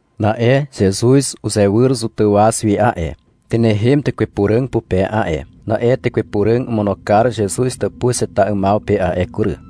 Na'e Zezuz uzewyr Zotàw waz wi a'e. Tynehem Tekwe Puràg pupe a'e. Na'e Tekwe Puràg omono kar Zezuz tàpuz heta 'ymaw pe a'e kury.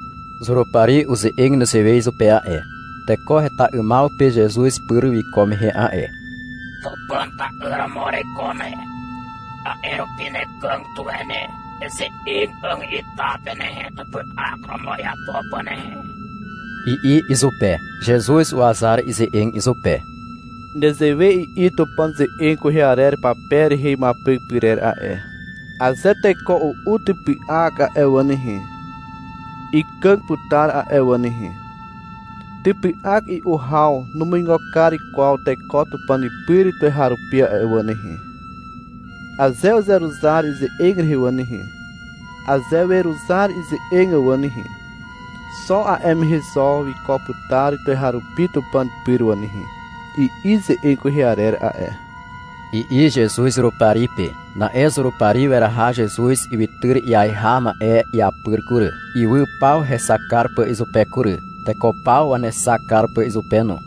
Zurupari uze'eg nezewe izupe a'e, teko heta 'ymaw pe Zezuz pyr wiko mehe a'e. — Tupàn ta'yr romo ereiko ne. A'e rupi nekàg tuwe ne. Eze'eg 'àg ita pe nehe, typy'ak romo iapo pà nehe, i'i izupe. Zezuz uwazar ize'eg izupe. — Nezewe i'i Tupàn ze'eg kwehe arer pape rehe imuapyk pyrer a'e. Aze teko u'u typy'ak a'e wà nehe, ikàg putar a'e wà nehe. Typy'ak i'u haw numuigo kar kwaw teko Tupàn pyr tuweharupi a'e wà nehe. Aze uzeruzar ize'eg rehe wà nehe, aze weruzar ize'eg wà nehe, xo a'e mehe zo wiko putar tuweharupi Tupàn pyr wà nehe, i'i ze'eg kwehe arer a'e, i'i Zezuz Zurupari pe. Na'e Zurupari weraha Zezuz ywytyr iaiha ma'e iapyr kury, ywy paw hexak kar pà izupe kury, teko paw wanexak kar pà izupe no.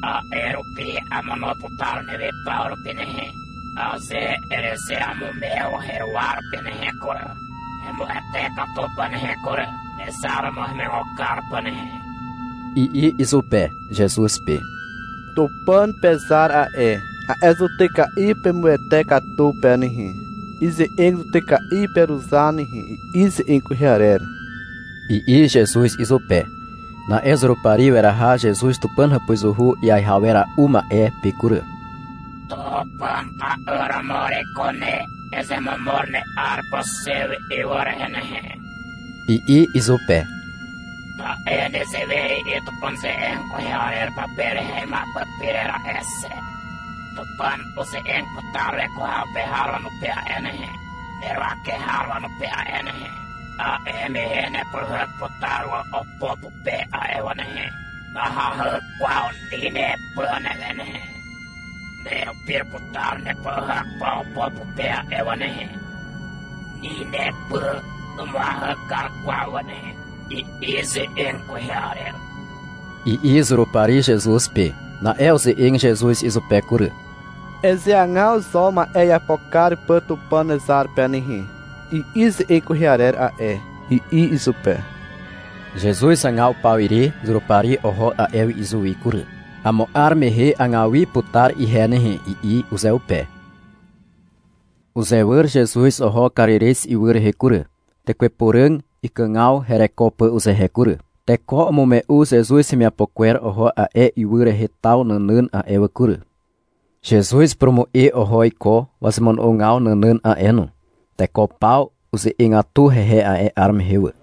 — A'e rupi amono putar newe paw rupi nehe, aze erezeamumew heruwa rupi nehe kury, hemuwete katu pà nehe kury, nezar romo hemuigo kar pà nehe, i'i izupe, Zezuz pe. — Tupàn pezar a'e, a'e zutyka'i pemuwete katu pe nehe, ize'eg zutyka'i peruzar nehe, i'i ze'eg kwehe arer, i'i Zezuz izupe. Na'e Zurupari weraha Zezuz Tupàn hàpuzuhu iaiha wera'u ma'e pe kury. — Tupàn ta'yr romo ereiko ne. Ezemomor ne'ar pà xe wi ywy rehe nehe, i'i izupe. — Ta'e nezewe i'i Tupàn ze'eg kwehe arer pape rehe imuapyk pyrer a'e xe. — Tupàn uze'eg putar weko haw pe har wanupe a'e nehe, neruwake har wanupe a'e nehe. A'e mehe nepyhyk putar wà opo pupe a'e wà nehe. Nahahy kwaw ni nepy newe nehe, — Nerupir putar nepyhyk pà opo pe a'e wà nehe. Ni nepy numuahy kar kwaw wà nehe, i'i ze'eg kwehe arer, i'i Zurupari Zezuz pe. Na'e uze'eg Zezuz izupe kury. — Ezeagaw zo ma'e iapo kar pà Tupàn nezar pe nehe, i'i ze'eg kwehe arer a'e, i'i izupe. Zezuz hagaw pawire Zurupari oho a'e wi izuwi kury. — Amo 'ar mehe agaw wi putar ihe nehe, i'i uzeupe. Uzewyr Zezuz oho Karirez ywy rehe kury, Tekwe Puràg ikàgaw hereko pà uzehe kury. Teko umume'u Zezuz hemiapo kwer oho a'e ywy rehe taw nànàn a'e wà kury. Zezuz upurumu'e oho iko wazemono'ogaw nànàn a'e no. Teko paw uze'egatu hehe a'e 'ar mehe wà.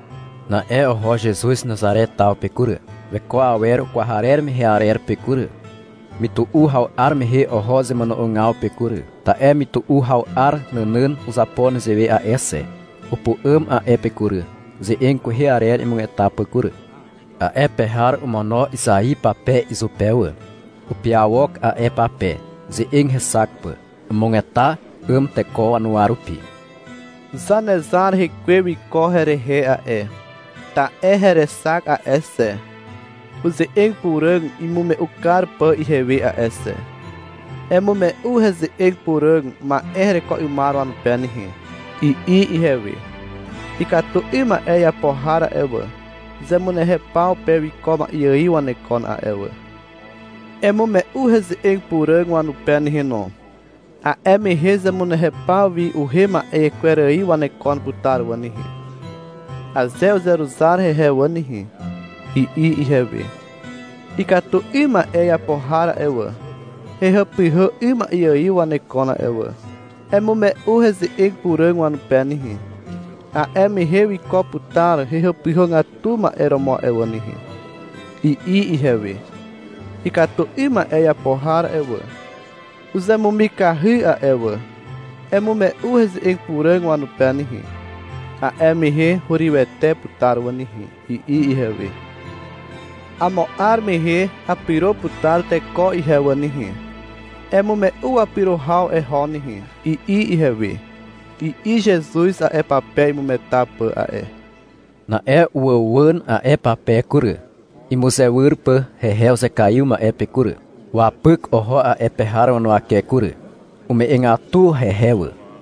Na'e oho Zezuz Nazare taw pe kury, weko awer ukwarer mehe arer pe kury. Mytu'u haw 'ar mehe oho zemono'ogaw pe kury. (Ta'e mytu'u haw 'ar nànàn uzapo nezewe a'e xe). Upu'àm a'e pe kury, ze'eg kwehe arer imugeta pà kury. A'e pe har omono Izai pape izupe wà. Upiawok a'e pape, ze'eg hexak pà. Umugeta 'àm teko wanuwa rupi. Zanezar Hekwe wiko herehe a'e. Ta'e herexak a'e xe, uze'eg puràg imume'u kar pà ihewe a'e xe. — Emume'u heze'eg puràg ma'e hereko 'ymar wanupe nehe, i'i ihewe. — Ikatu 'ym ma'e iapo har a'e wà, zemunehew paw pe wiko ma'e ài wanekon a'e wà. Emume'u heze'eg puràg wanupe nehe no, a'e mehe zemunehew paw wi uhem ma'e kwer ài wanekon putar wà nehe, aze uzeruzar hehe wà nehe, i'i ihewe. — Ikatu 'ym ma'e iapo har a'e wà, hehàpyhà 'ym ma'e ài wanekon a'e wà. Emume'u heze'eg puràg wanupe nehe, a'e mehe wiko putar hehàpyhàgatu ma'e romo a'e wà nehe, i'i ihewe. — Ikatu 'ym ma'e iapo har a'e wà, uzemumikahy a'e wà. Emume'u heze'eg puràg wanupe nehe. A'e mehe hurywete putar wà nehe, i'i ihewe. — Amo 'ar mehe apyro putar teko ihe wà nehe. Emume'u wapyro haw eho nehe, i'i ihewe, i'i Zezuz a'e pape imugeta pà a'e. Na'e uwàuwàn a'e pape kury, imuzewyr pà hehe uzekaiw ma'e pe kury. Wapyk oho a'e pe har wanuwake kury. Ume'egatu hehe wà.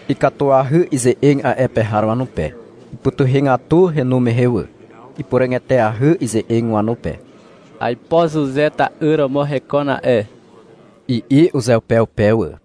Ikatuahy ize'eg a'e pe har wanupe. Ipytuhegatu henu mehe wà. Ipuràg eteahy ize'eg wanupe. — Aipo Zuze ta'yr romo hekon a'e, i'i uzeupeupe wà.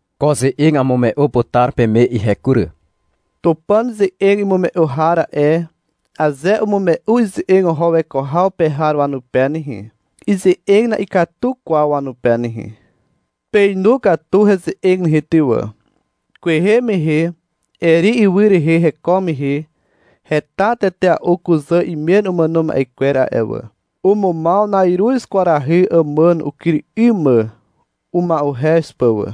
Ko ze'eg amume'u putar peme ihe kury. Tupàn ze'eg imume'u har a'e, aze umume'u ize'eg oho weko haw pe har wanupe nehe, ize'eg na'ikatu kwaw wanupe nehe. Peinu katu heze'eg nehe ty wà. Kwehe mehe, Eri ywy rehe heko mehe heta tetea'u kuzà imen umàno ma'e kwer a'e wà. Umumaw na'iruz kwarahy àmàn ukyr 'ym mà uma'uhez pà wà.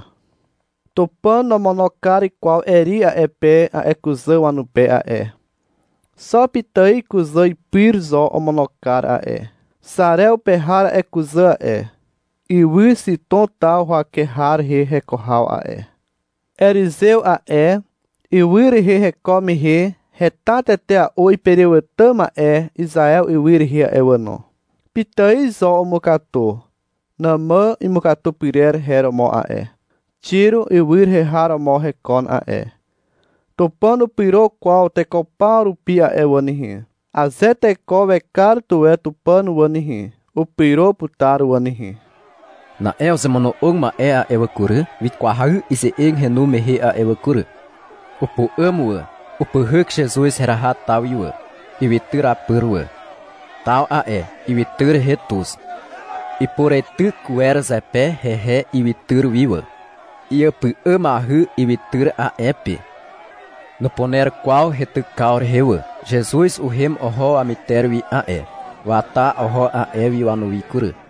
Tupàn nomono kar kwaw Eri a'e pe a'e kuzà wanupe a'e. Xo pitài kuzà pyr zo omono kar a'e. Xarew pe har a'e kuzà a'e. Ywy Xitom taw huwake har rehe heko haw a'e. Erizew a'e, ywy rehe heko mehe heta tetea'u iperewàtà ma'e Izaew ywy rehe a'e wà no. Pitài zo umukatu. Nàmà imukatu pyrer her romo a'e. Xiro ywy rehe har romo hekon a'e. Tupàn nupyro kwaw teko paw rupi a'e wà nehe. Aze teko wekar tuwe Tupàn wà nehe, upyro putar wà nehe. Na'e uzemono'og ma'e a'e wà kury, wikwahy ize'eg henu mehe a'e wà kury. Upu'àm wà, upyhyk Zezuz heraha taw wi wà, ywytyr apyr wà. (Taw a'e ywytyr rehe tuz.) Ipureityk wer zepe hehe ywytyr wi wà. Iàpy'àmahy ywytyr a'e pe. Nupuner kwaw heitykaw rehe wà. Zezuz uhem oho wamyter wi a'e. Wata oho a'e wi wanuwi kury.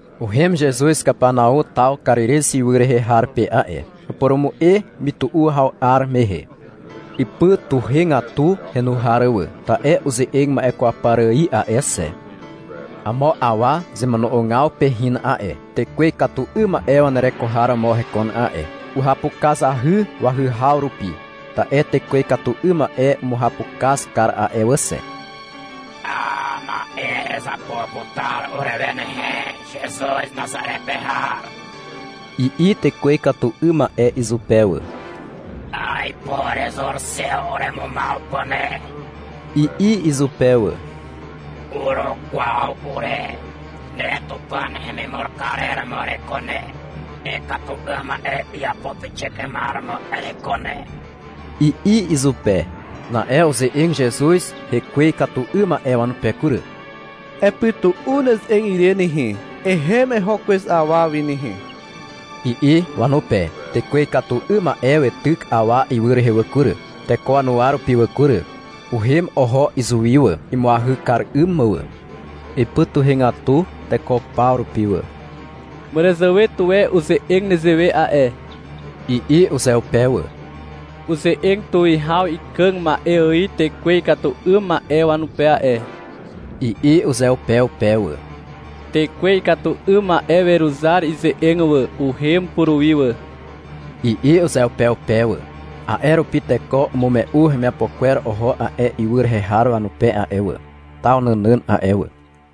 Uhem Zezuz Kapanau taw Karirez ywy rehe har pe a'e. Upurumu'e mytu'u haw 'ar mehe. Ipytuhegatu henu har wà, ta'e uze'eg ma'e kwaw par ài a'e xe. Amo awa zemono'ogaw pe hin a'e. Tekwe ikatu 'ym ma'e wanereko har romo hekon a'e. Uhapukazahy wahyhaw rupi, ta'e tekwe ikatu 'ym ma'e umuhapukaz kar a'e wà xe. A, ma'e erezapo putar urewe nehe, Zezuz Nazare pe har, i'i tekwe ikatu 'ym ma'e izupe wà. — Aipo erezur xe uremumaw pà ne, i'i izupe wà. Urukwaw ure, ne Tupàn hemimur karer romo ereiko ne, ikatu 'ym ma'e iapo pixik 'ymar romo ereiko ne, i'i izupe. Na'e uze'eg Zezuz hekwe ikatu 'ym ma'e wanupe kury. — Epytu'u neze'eg ire nehe, ehem eho kwez awa wi nehe, i'i wanupe. Tekwe ikatu 'ym ma'e weityk awa ywy rehe wà kury, teko wanuwa rupi wà kury, uhem oho izuwi wà, imuahy kar 'ym mà wà. Ipytuhegatu teko paw rupi wà. Màràzàwe tuwe uze'eg nezewe a'e, i'i uzeupeupe wà. — Uze'eg tuwihaw ikàg ma'e ài tekwe ikatu 'ym ma'e wanupe a'e, i'i uzeupeupe wà. — Tekwe ikatu 'ym ma'e weruzar ize'eg wà, uhem puruwi wà, i'i uzeupeupe wà. A'e rupi teko umume'u hemiapo kwer oho a'e ywy rehe har wanupe a'e wà, taw nànàn a'e wà.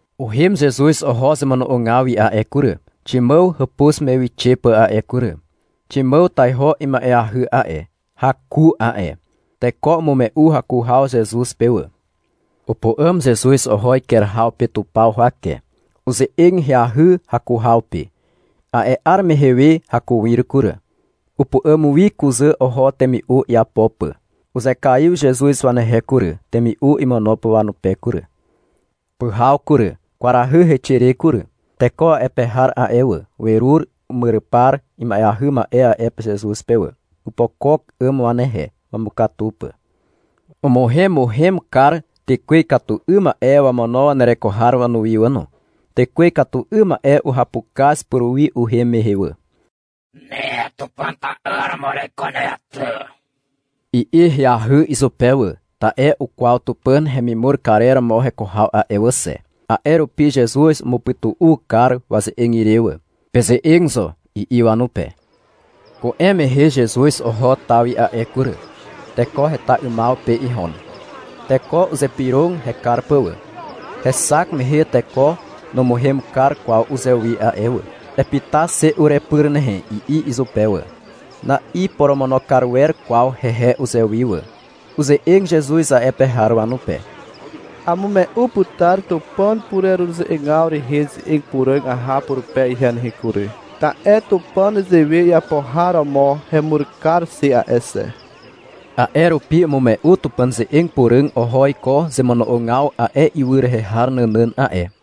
Uhem Zezuz oho zemono'ogaw wi a'e kury, Ximàw hàpuz me wixe pà a'e kury. Ximàw taiho ima'eahy a'e, haku a'e. Teko umume'u haku haw Zezuz pe wà. Upu'àm Zezuz oho iker haw pe tupaw huwake. Uze'eg ahyahy haku haw pe. A'e 'ar mehe we hakuir kury. Upu'àm wi kuzà oho temi'u iapo pà. Uzekaiw Zezuz wanehe kury, temi'u imono pà wanupe kury. Pyhaw kury, kwarahy heixe re kury. Teko a'e pe har a'e wà, werur umyrypar ima'eahy ma'e a'e pe Zezuz pe wà. Opokok 'àm wanehe, wamukatu pà. Umuhemuhem kar tekwe ikatu 'ym ma'e wamono wanereko har wanuwi wà no. Tekwe ikatu 'ym ma'e uhapukaz puruwi uhem mehe wà. — Ne Tupàn ta'yr romo ereiko ne ty, i'i ahyahy izupe wà. Ta'e ukwaw Tupàn hemimur karer romo heko haw a'e wà xe. A'e rupi Zezuz umupytu'u kar waze'eg ire wà. — Peze'eg zo, i'i wanupe. Ku'em mehe Zezuz oho taw wi a'e kury. Teko heta 'ymaw pe ihon. Teko uzypyrog hekar pà wà. Hexak mehe teko numuhem kar kwaw uzewi a'e wà. Epyta xe urepyr nehe, i'i izupe wà. Na'iporomono kar wer kwaw hehe uzewi wà. Uze'eg Zezuz a'e pe har wanupe. Amume'u putar Tupàn pureruze'egaw rehe ze'eg puràg aha purupe ihe nehe kury. Ta'e Tupàn nezewe iapo har romo hemur kar xe a'e xe. A'e rupi umume'u Tupàn ze'eg puràg oho iko zemono'ogaw a'e ywy rehe har nànàn a'e.